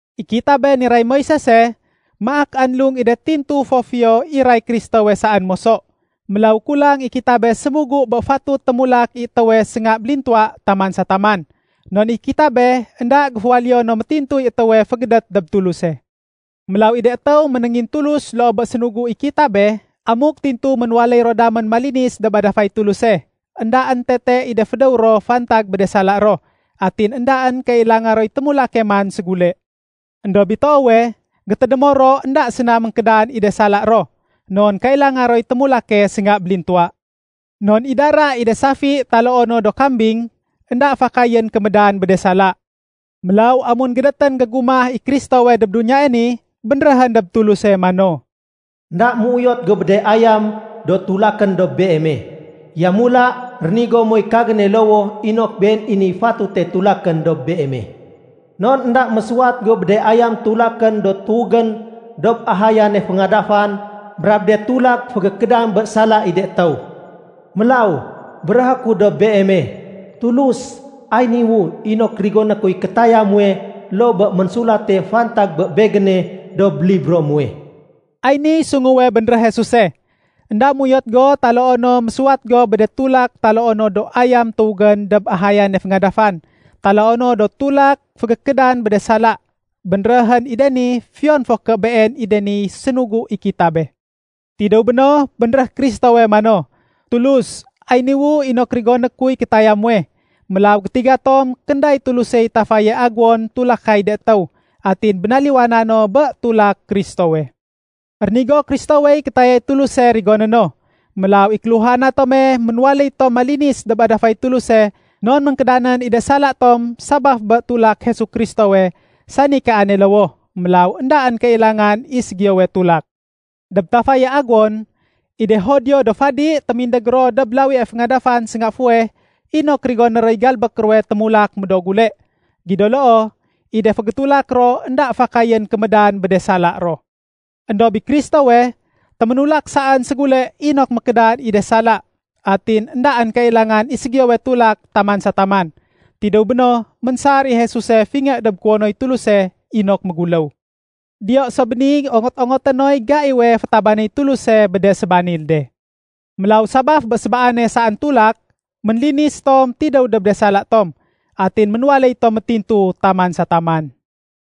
I kitabe niray Moisese, maak anlung i de tintu fo fiyo iray Kristowe saén moso. Mélaw kulang i kitabe sémugu bé fatut témulak i étéwe sénga bélintuwa taman sa taman. Non i kitabe énda géféwaléyo no métintuy étéwe fégédét dob Tuluse. Mélaw i de étéw ménéngintulus loo bé sénugu i kitabe, amuk tintu ménwaléy ro damén malinis dob adafay Tuluse, éndaén tete i de fédéw ro fantag bé de sala ro, atin éndaén kailanga roy témulake man ségule. Endob i toowe, gétédémo ro énda séna ménkédan i de sala ro, non kailanga roy témulake sénga bélintuwa. Non i dara i de safi taloo no do kambing, énda fakayén kémédan bé de sala. Mélaw amun gédétén gégumah i Kristowe dob duniyae ni, bénréhén dob Tuluse mano, “Enda méuyot go bé de ayam do tulakén dob Beeme. Yamula rénigo moy kagéne lowoh inok been i niy fatute tulakén dob Beeme. Non énda mésuwat go bé de ayam tulakén do tuwégén dob ahayane féngadafan brab de tulak fégékédan bé sala i de étéw. Mélaw, béréhé ku dob Beeme, Tulus, ay niwu inok rigoné kuy kétaya muwe loo bé ménsulate fantag bé begéne dob libro muwe.” Ay niy sunguwe bénréh Jesuse, “Enda méuyot go taloo no mésuwat go bé de tulak taloo no do ayam tuwégén dob ahayane féngadafan taloo no do tulak fégékédan bé de sala.” Bénréhén i de ni fiyon fo ké been i de niy sénugu i kitabe. Tidéw béno, bénréh Kristowe mano, “Tulus, ay niwu inok rigoné kuy kétaya muwe.” Mélaw gétiga tom kénday Tulusey tafaye aguwon tulakay de étéw. Atin bénaliwana no bé tulak Kristowe. Rénigo Kristowey kétayay Tuluse rigoné no. Mélaw i kéluhana tome ménwaléy tom malinis dob adafay Tuluse non ménkédanén i de sala tom sabaf bé tulak Jesu Kristowe, sani kaane lowoh. Mélaw éndaén kailangan i ségiyowe tulak. Dob tafaye aguwon, i de Judio do fadi témindég ro dob lawie féngadafan sénga fuweh inok rigoné roy galbék ruwe témulak médoo gule. Gido loo, i de fégétulak ro énda fakayén kémédan bé de sala ro. Endob i Kristowe, téménulak saén ségule inok mékédan i de sala. Atin éndaén kailangan i ségiyowe tulak taman sa taman. Tidéw béno, ménsar i Jesuse fingé dob kuwonoy Tuluse inok méguléw. Diyo so béni ongot-ongoté noy gaiwe fétabanéy Tuluse bé de sébanil de. Mélaw sabaf bé sébaane saén tulak, ménlinis tom tidéw dob de sala tom, atin ménwaléy tom métintu taman sa taman.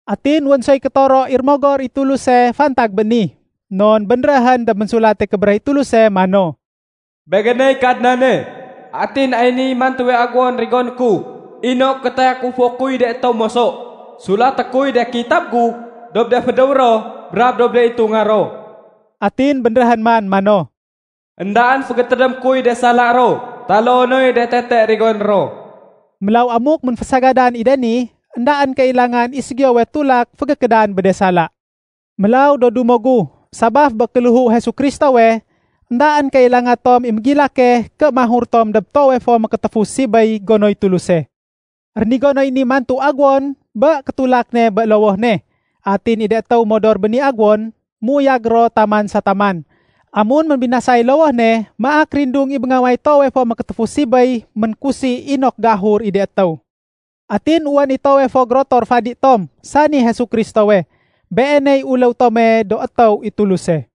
Atin wén soy kétoro i Rémogor i Tuluse fantag bé ni. Non bénréhén dob Ménsulate Kébéréh i Tuluse mano, “Begéney Kadnane, atin ay niy mantuwe aguwon rigoné ku inok gétayakufo kuy de étéw moso. Sulaté kuy de kitab gu dob de fédéw ro brab dob de itunga ro.” Atin bénréhén man mano, “Endaén fégétédémé kuy de sala ro taloo noy de tete rigoné ro.” Mélaw amuk ménfésagadan i de ni, éndaén kailangan i ségiyowe tulak fégékédan bé de sala. Mélaw, do dumo gu, sabaf bé kéléhu Jesu Kristowe, éndaén kailanga tom i mégilake ké mahur tom dob Toowe fo Mékétéfu Sibéy gonoy Tuluse. Rénigo noy mantuwe aguwon bé kétulak ne bé lowoh ne. Atin i de étéw modor bé ni aguwon, méuyag ro taman sa taman. Amun ménbinasay lowoh ne maak rindung i béngaway Toowe fo Mékétéfu Sibéy ménkusi inok géahur i de étéw. Atin wén i toowe fo gérotor fadi tom, sani Jesu Kristowe. Beeney uléw tome do étéw i Tuluse.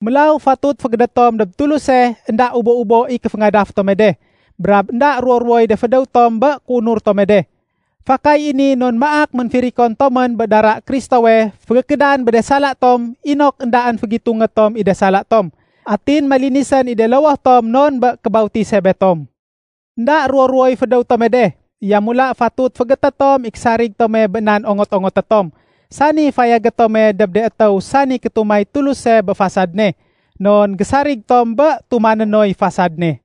Mélaw fatut fégédét tom dob Tuluse énda ubo-ubo i kéféngadaf tome de, brab énda ruwo-ruwoy de fédéw tom bé kéunur tome de. Fakay i ni non maak ménfirikon tomén bé dara Kristowe fégékédan bé de sala tom inok éndaén fégitungé tom i de sala tom. Atin malinisén i de lowoh tom non bé kébautise betom. Enda ruwo-ruwoy fédéw tome de. Yamula fatut féégété tom i késarig tome bé nan ongot-ongoté tom, sani fayagé tome dob de étéw sani kétumay Tuluse bé fasad ne. Non gésarig tom bé tumané noy fasad ne.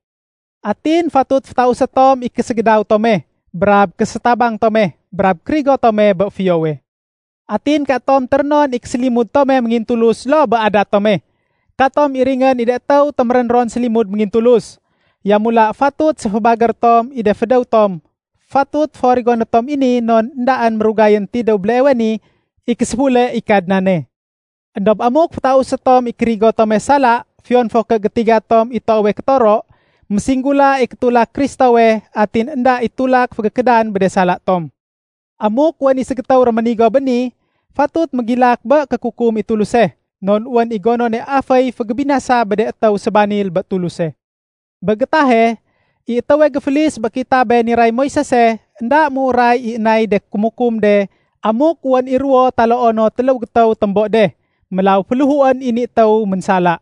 Atin fatut fétausé tom i késégédaw tome, brab késétabang tome, brab kérigo tome bé fiyowe. Atin katom térénon i késélimud tome méngintulus loo bé adat tome. Katom iringén i de étéw témérén ron sélimud méngintulus. Yamula, fatut séfébagéré tom i de fédéw tom. Fatut fo rigoné tom i ni non éndaén mérugayén tidéw béleewe niy késéfule i Kadnane. Endob amuk fétausé tom i kérigo tome sala fiyon fo ké gétiga tom i toowe kétoro, ménsinggula i kétulak Kristowe atin énda i tulak fégékédan bé de sala tom. Amuk wén i ségétéw réménigo bé ni, fatut mégilak bé kékukum i Tuluse. Non wén i gonone aféy fégébinasa bé de étéw sébanil bé Tuluse. Bé gétahe, i étéwe géfélis bé kitabe niray Moisese, énda méuray i nay de kémukum de amuk wén i ruwo taloo no téléw gétéw témbo de. Mélaw féléhuén i ni étéw ménsala.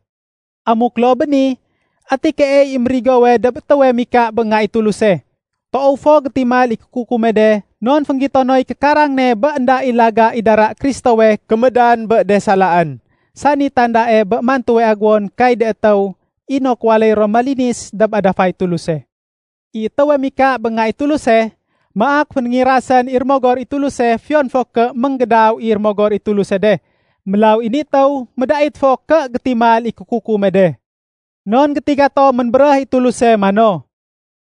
Amuk loo bé ni, ati keey i mérigowe dob étéwe mika bé Nga i Tuluse? Toow fo gétimal i kékukume de non fénggito noy kékarang ne bé énda i laga i dara Kristowe kémédan bé de salaén, sani tandae bé mantuwe aguwon kay de étéw inok waléy ro malinis dob adafay Tuluse. I étéwe mika bé Nga i Tuluse, maak fénéngirasén i Rémogor i Tuluse fiyon fo ké ménggédaw i Rémogor i Tuluse de. Mélaw i ni étéw médait fo ké gétimal i kékukume de. Non gétiga tom ménbéréh i Tuluse mano,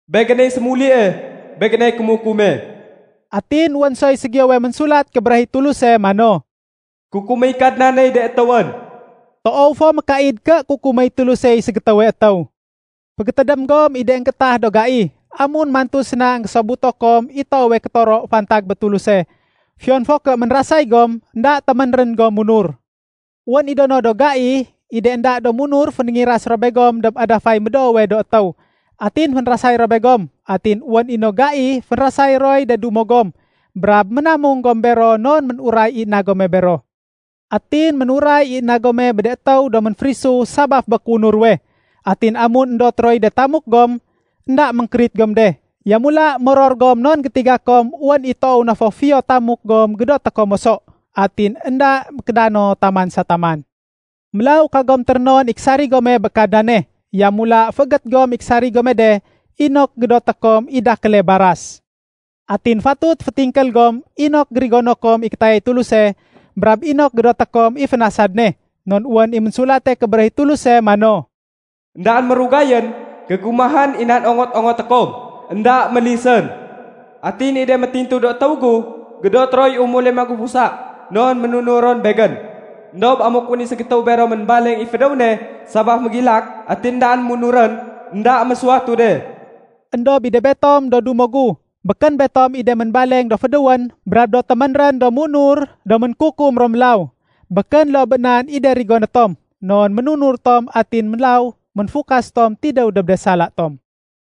“Begéney sémulie, Begéney kémukume.” Atin wén soy ségiyowe Ménsulat Kébéréh i Tuluse mano, “Kukuméy Kadnaney de étéwén.” Toow fo mékaid ké kukuméy Tulusey ségétéwe étéw. Fégétédém gom i de énggétah do gai, amun mantu séna énggésobuto kom i toowe kétoro fantag bé Tuluse. Fiyon fo ké ménrasay gom, énda téménrén gom munur. Wén i do no do gai, i de énda munur fénéngiras ro begom dob adafay médoowe do étéw atin fénrasay ro begom. Atin wén i no gai fénrasay roy de dumo gom, brab ménamung gom bero non ménuray i na gome bero. Atin ménuray i na gome bé de étéw do ménférisu sabaf bé kéunur ruwe. Atin amun éndot roy de tamuk gom, énda ménkérit gom de. Yamula moror gom non gétiga kom wén i toow na fo fiyo tamuk gom gédoté kom moso, atin énda mékédano taman sa taman. Mélaw, kagom térénon i késarig gome bé Kadnane. Yamula féégét gom i késarig gome de inok gédoté kom i dakéle baras. Atin fatut fétingkél gom inok gérigono kom i kétayay Tuluse brab inok gédoté kom i fénasad ne. Non wén i Ménsulate Kébéréh i Tuluse mano, “Endaén mérugayén, gégumahén i nan ongot-ongoté kom. Enda mélisén. Atin i de métintu do étéw gu, gédoté roy umule magufusa non ménunur ro Begén. Endob amuk wén i ségétéw bero ménbaleng i fédéw ne sabaf mégilak atin éndaén munurén, énda mésuwatu de.” Endob i de betom, do dumo gu, békén betom i de ménbaleng do fédéwén brab do téménrén do munur do mékukum ro mélaw. Békén loo bé nan i de rigoné tom, non ménunur tom atin mélaw méfukas tom tidéw dob de sala tom.